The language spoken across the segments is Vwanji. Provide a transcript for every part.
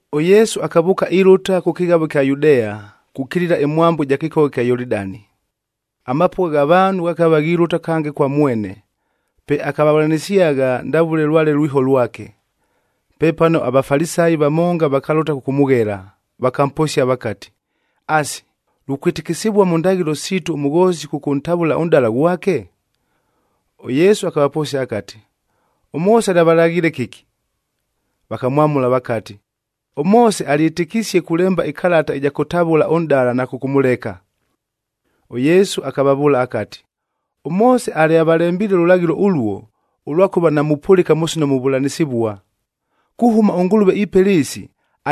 ɄYesu akavʉʉka ilʉta kʉ kɨghavoa ɨkya Yudea, kukilila ɨmwambo ɨja kɨkogha kya Yolidani. Amapʉgha gha vaanhu ghakava ghilʉta kange kwa mwene, pe akavavʉlanɨsyagha ndavʉle lwale lwiho lwake. Pepano aVafalisayi vamonga vakalʉta kʉkʉmʉghela, vakamposia vakati, “Asi, lukwɨtɨkɨsɨvua mʉ ndaghɨlo siitu ʉmʉghoosi kʉkʉntavʉla ʉnʼdala ghwake?” ɄYesu akavaposia akati, “ɄMoose alyavalaghiile kɨki?” Vakamwamʉla vakati, “ɄMoose alyɨtɨkisie kulemba ɨkalata ɨja kʉtavʉla ʉnʼdala na kʉkʉmʉleka.” ɄYesu akavavʉʉla akati, “ɄMoose alyavalembiile ʉlʉlaghɨlo ʉluo, ʉlwakʉva namupʉlɨka mʉ sino muvʉlanɨsɨvua. Kuhʉma ʉNgʉlʉve ipela ɨɨsi,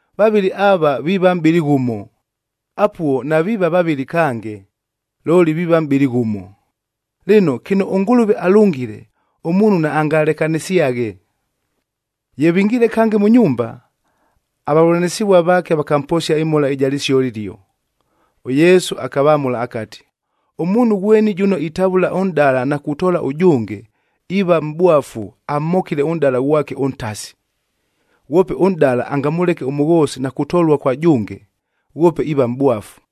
vavɨlɨ ava viiva mʼbɨlɨ ghʉmo.’d Apuo naviiva vavɨlɨ kange, looli viiva mʼbɨlɨ ghʉmo. Lɨno, kɨno ʉNgʉlʉve alʉngile, ʉmuunhu naangalekanɨsyaghe.” Ye vingiile kange mʉ nyumba, avavʉlanɨsɨvua vaake vakamposia ɨmhola ɨja lɨsio ɨlio. ɄYesu akavamʉla akati, “Ʉmuunhu ghweni jʉno itavʉla ʉnʼdala na kutoola ʉjʉnge, iiva mʼbwafu amhokile ʉnʼdala ghwake ʉntasi. Ghwope ʉnʼdala angamʉleke ʉmʉghoosi na kutolua kwa jʉnge, ghwope iiva mʼbwafu.”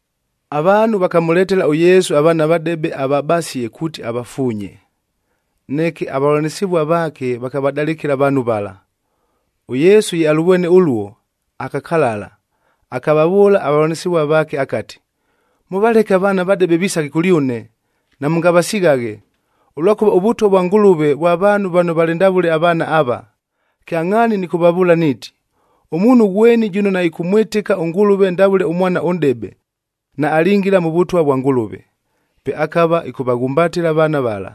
Avaanhu vakamʉletela ʉYesu avaana avadebe avabasie kuuti avafuunye, neke avavʉlanɨsɨvua vaake vakavadalɨkɨla avaanhu vala. ɄYesu ye alʉvwene ʉluo, akakalala, akavavʉʉla avavʉlanɨsɨvua vaake akati, “Mʉvaleke avaana avadebe visaghe kʉlyʉne, namʉngavasighaghe, ʉlwakʉva ʉVʉtwa vwa Ngʉlʉve vwa vaanhu vano valɨ ndavʉle avaana ava. Kyangʼhaani nɨkʉvavʉʉla niiti, ʉmuunhu ghweni jʉno naɨkʉmwɨtɨka ʉNgʉlʉve ndavʉle ʉmwana ʉnʼdebe, naalingila mʉ Vʉtwa vwa Ngʉlʉve.” Pe akava ɨkʉvaghumbatɨla avaana vala,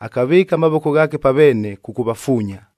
akavɨɨka amavoko ghaake pa veene kʉkʉvafuunya.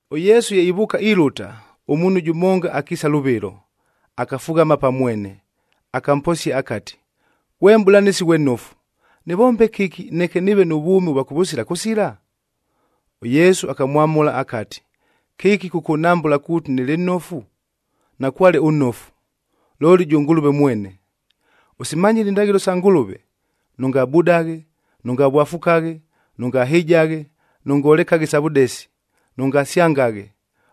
ɄYesu ye ivʉʉka ilʉta, ʉmuunhu jʉmonga akiisa lʉvɨlo, akafughama pa mwene, akamposia akati, “Ghwe Mʼbʉlanɨsi ghwe nnofu, nɨvombe kɨki neke nɨɨve nʉ vwʉmi ʉvwa kʉvʉsila kʉsila?” ɄYesu akamwamʉla akati, “Kɨki kʉkʉnhambʉla kuuti nɨlɨ nnofu? Nakwale ʉnnofu, looli jʉ Ngʉlʉve mwene. Ʉsimanyile indaghɨlo isa Ngʉlʉve: ‘Nʉngabudaghe, nʉngavwafukaghe, nʉngahɨjaghe, nʉngolekaghe isa vʉdesi, nʉngasyangaghe,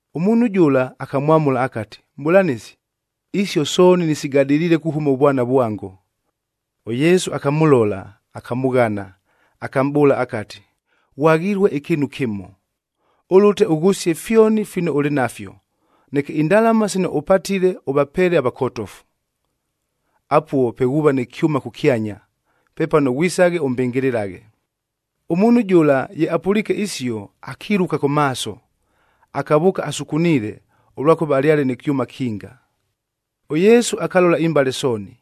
Ʉmuunhu jʉla akamwamʉla akati, “Mʼbʉlanɨsi, isio sooni nɨsigadɨliile kuhʉma ʉvwana vwango.” ɄYesu akamʉlola, akamʉghana, akamʼbʉʉla akati, “Ghwaghilue ɨkɨɨnu kɨmo. Ʉlʉte ʉghʉsie fyoni fino ʉlɨ nafyo, neke indalama sino ʉpatile ʉvapeele avakotofu. Apuo pe ghuuva nɨ kyʉma kʉkyanya. Pepano ghwisaghe ʉmbɨngɨlɨlaghe.” Ʉmuunhu jʉla ye apʉliike isio, akiluka kʉ maaso, akavʉʉka asukuniile, ʉlwakʉva alyale nɨ kyʉma kinga. ɄYesu akalola imbale sooni,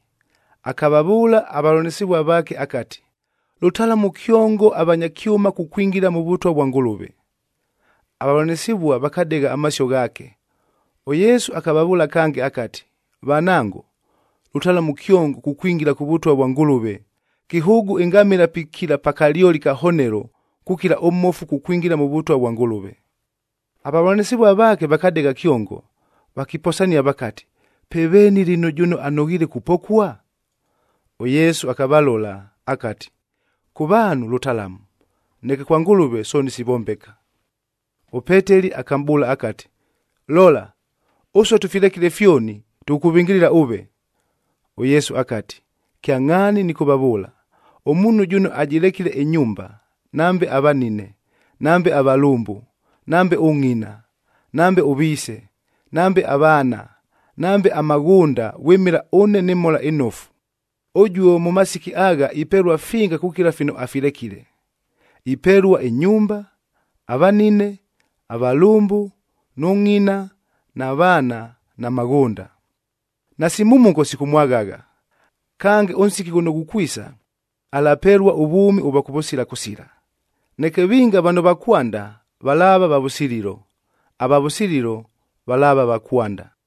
akavavʉʉla avavʉlanɨsɨvua vaake akati, “Lʉtalamu kyongo avanya kyʉma kukwingila mʉ Vʉtwa vwa Ngʉlʉve!” Avavʉlanɨsɨvua vakadegha amasio ghaake. ɄYesu akavavʉʉla kange akati, “Vanango, lʉtalamu kyongof kukwingila kʉ Vʉtwa vwa Ngʉlʉve! Kɨhʉʉgʉ ɨngamɨla pikila pa kalyoli ka honelo, kukila ʉmmofu kukwingila mʉ Vʉtwa vwa Ngʉlʉve.” Avavʉlanɨsɨvua vaake vakadegha kyongo, vakiposania vakati, “Pe veeni lɨno jʉno anoghiile kupokua?” ɄYesu akavalola, akati, “Kʉ vaanhu lʉtalamu, neke kwa Ngʉlʉve sooni sivombeka.” ɄPeteli akamʼbʉʉla akati, “Lola, ʉsue tʉfilekile fyoni, tʉkʉkʉvɨngɨlɨla ʉve.” ɄYesu akati, “Kyangʼhaani nɨkʉvavʉʉla, ʉmuunhu jʉno ajɨlekile ɨnyumba, nambe avanine, nambe avalʉmbʉ, nambe ʉngʼina, nambe ʉviise, nambe avaana, nambe amaghʉnda vwɨmɨla ʉne nɨ Mhola ɨNofu, ʉjuo mʉ masiki agha ipelua finga kukila fino afilekile. Ipelua ɨnyumba, avanine, avalʉmbʉ, nʉ ngʼina na vaana na maghʉnda. Nasi mhumuko sikʉmwaghagha. Kange, ʉnsiki ghʉno ghukwisa, alapelua ʉvwʉmi ʉvwa kʉvʉsila kʉsila. Neke vinga vano va kwanda valaava va vʉsililo, ava vʉsililo valaava va kwanda.”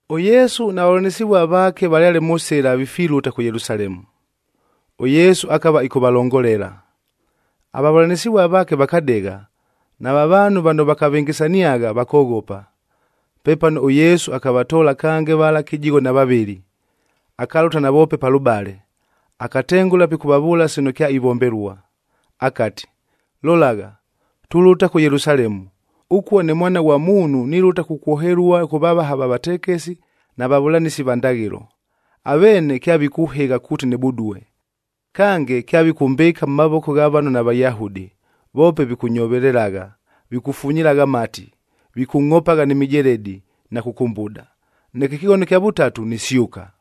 ɄYesu na vavʉlanɨsɨvua vaake valyale mʉ sɨla vifilʉta kʉ Yelusalemu. ɄYesu akava ɨkʉvalongolela. Avavʉlanɨsɨvua vaake vakadegha, nava vaanhu vano vakavɨngɨsaniagha vakoghopa. Pepano ʉYesu akavatoola kange vala kɨjigho na vavɨlɨ, akalʉta navoope palʉbale, akatengʉla pikʉvavʉʉla sino kyaivombelua. Akati, “Lolagha, tulʉta kʉ Yelusalemu, ʉkuo ʉne ne Mwana ghwa Muunhu nilʉta kukwohelua kʉ vavaha va vatekesi na vavʉlanɨsi va ndaghɨlo. Aveene kyavikʉhɨgha kuuti nɨbudue. Kange, kyavikʉmbɨɨka mʉ mavoko gha vano naVayahudi, voope vikʉnyovelelagha, vikʉfunyilagha amati, vikʉngʼhopagha ni mijeledi na kʉkʉmbuda. Neke ɨkɨghono ɨkya vʉtatu nisyʉka.”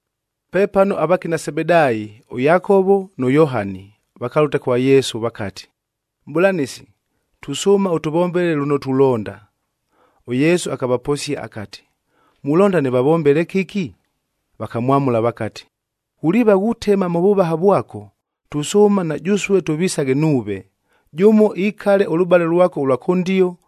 Pepano avakina Sebedaayi ʉYakovo nʉ Yohani, vakalʉta kwa Yesu vakati, “Mʼbʉlanɨsi, tusʉʉma ʉtʉvombele lʉno tulonda.” ɄYesu akavaposia akati, “Mulonda nɨvavombele kɨki?” Vakamwamʉla vakati, “Ghuliiva ghutema mʉ vʉvaha vwako, tusʉʉma na jʉsue tʉvisaghe nuuve, jʉmo ikale ʉlʉbale lwako ʉlwa kʉndio,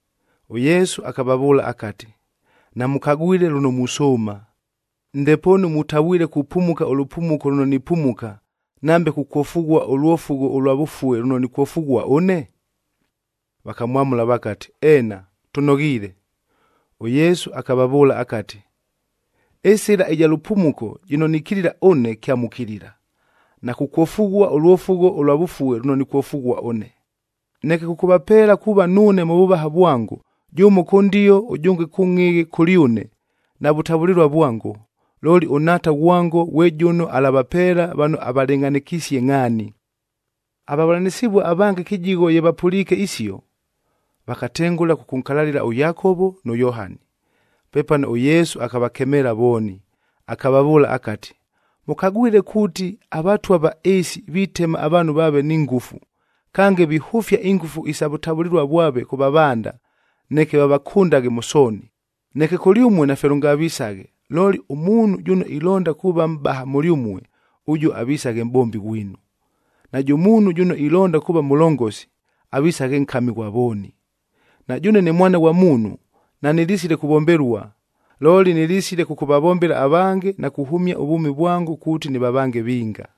ɄYesu akavavʉʉla akati, “Namʉkagwile lʉno musʉʉma. Ndepoonu mutavwile kupumuka ʉlʉpumuko lʉno nipumuka,h nambe kukwofughua ʉlwofugho ʉlwa vʉfue lʉno nikwofughua ʉne?” Vakamwamʉla vakati, “Eena, tʉnoghiile.” ɄYesu akavavʉʉla akati, “Ɨsɨla ɨja lʉpumuko jɨno nikilila ʉne kyamukilila, na kukwofughua ʉlwofugho ʉlwa vʉfue lʉno nikwofughua ʉne. Neke kʉkʉvapeela kuuva nuune mʉ vʉvaha vwango, jʉmo kʉndio ʉjʉnge kʉngʼhɨghɨ kʉlyʉne, navʉtavʉlɨlua vwango. Looli ʉNhaata ghwango ghwe jʉno alavapeela vano avalɨngʼhanɨkisie ngʼhaani.” Avavʉlanɨsɨvua avange kɨjigho ye vapʉliike isio, vakatengʉla kʉkʉnkalalɨla ʉYakovo nʉ Yohani. Pepano ʉYesu akavakemeela vooni, akavavʉʉla akati, “Mʉkagwile kuuti, avatwa va ɨɨsi vitema avaanhu vaave ni ngʉfu. Kange, vihʉfia ingʉfu isa vʉtavʉlɨlua vwave kʉ vavanda, neke vavakʉndaghe mʉ sooni. Neke kʉlyʉmue nafye lʉngavisaghe. Looli ʉmuunhu jʉno ilonda kuuva mʼbaha mʉlyʉmue, ʉjuo avisaghe mʼbombi ghwinu. Najʉ muunhu jʉno ilonda kuuva mʉlongosi, avisaghe nkami ghwa vooni. Na jʉʉne ne Mwana ghwa Muunhu nanɨlisile kuvombelua, looli nɨlisile kʉkʉvavombela avange na kuhʉmia ʉvwʉmi vwango kuuti nɨvavange vinga.”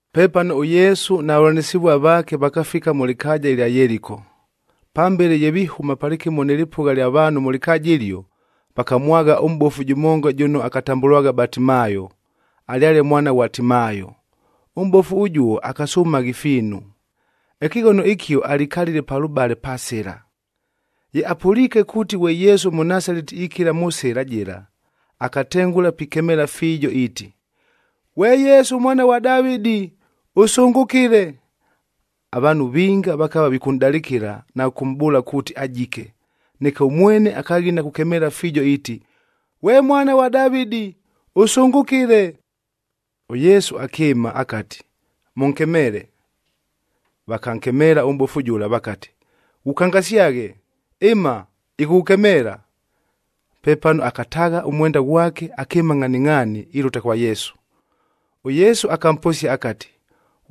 Pepano ʉYesu na vavʉlanɨsɨvua vaake vakafika mʉ lɨkaaja ɨlya Yeliko. Pambele ye vihʉma palɨkɨmo nɨ lɨpʉgha lya vaanhu mʉ lɨkaaja ɨlio, vakamwagha ʉmʼbofu jʉmonga jʉno akatambʉlwagha Batimaayo, alyale mwana ghwa Timaayo. Ʉmʼbofu ʉjuo akasʉmagha ifiinu. Ɨkɨghono ɨkio, alikalile palʉbale pa sɨla. Ye apʉliike kuuti ghwe Yesu ʉMʉnasaleti ikila mʉ sɨla jɨla, akatengʉla pikemeela fiijo iiti, “Ghwe Yesu Mwana ghwa Davɨdi,i ʉsʉngʉkɨle!” Avaanhu vinga vakava vikʉnʼdalɨkɨla na kʉkʉmʼbʉʉla kuuti ajike, neke ʉmwene akaghina kukemeela fiijo iiti, “Ghwe Mwana ghwa Davɨdi, ʉsʉngʉkɨle!” ɄYesu akɨɨma akati, “Mʉnkemeele.” Vakankemeela ʉmʼbofu jʉla vakati, “Ghukangasyaghe, ɨma, ɨkʉkʉkemeela.” Pepano akataagha ʉmwenda ghwake, akɨɨma ngʼhaningʼhaani ilʉta kwa Yesu. ɄYesu akamposia akati,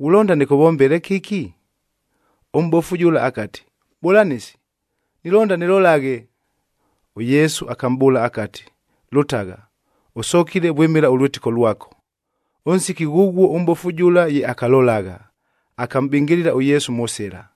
“Ghulonda nɨkʉvombele kɨki?” Ʉmʼbofu jʉla akati, “Mʼbʉlanɨsi, nilonda nɨlolaghe.” ɄYesu akamʼbʉʉla akati, “Lʉtagha, ʉsokile vwɨmɨla ʉlwɨtɨko lwako.” Ʉnsiki ghʉghuo ʉmʼbofu jʉla ye akalolagha, akamʼbɨngɨlɨla ʉYesu mʉ sɨla.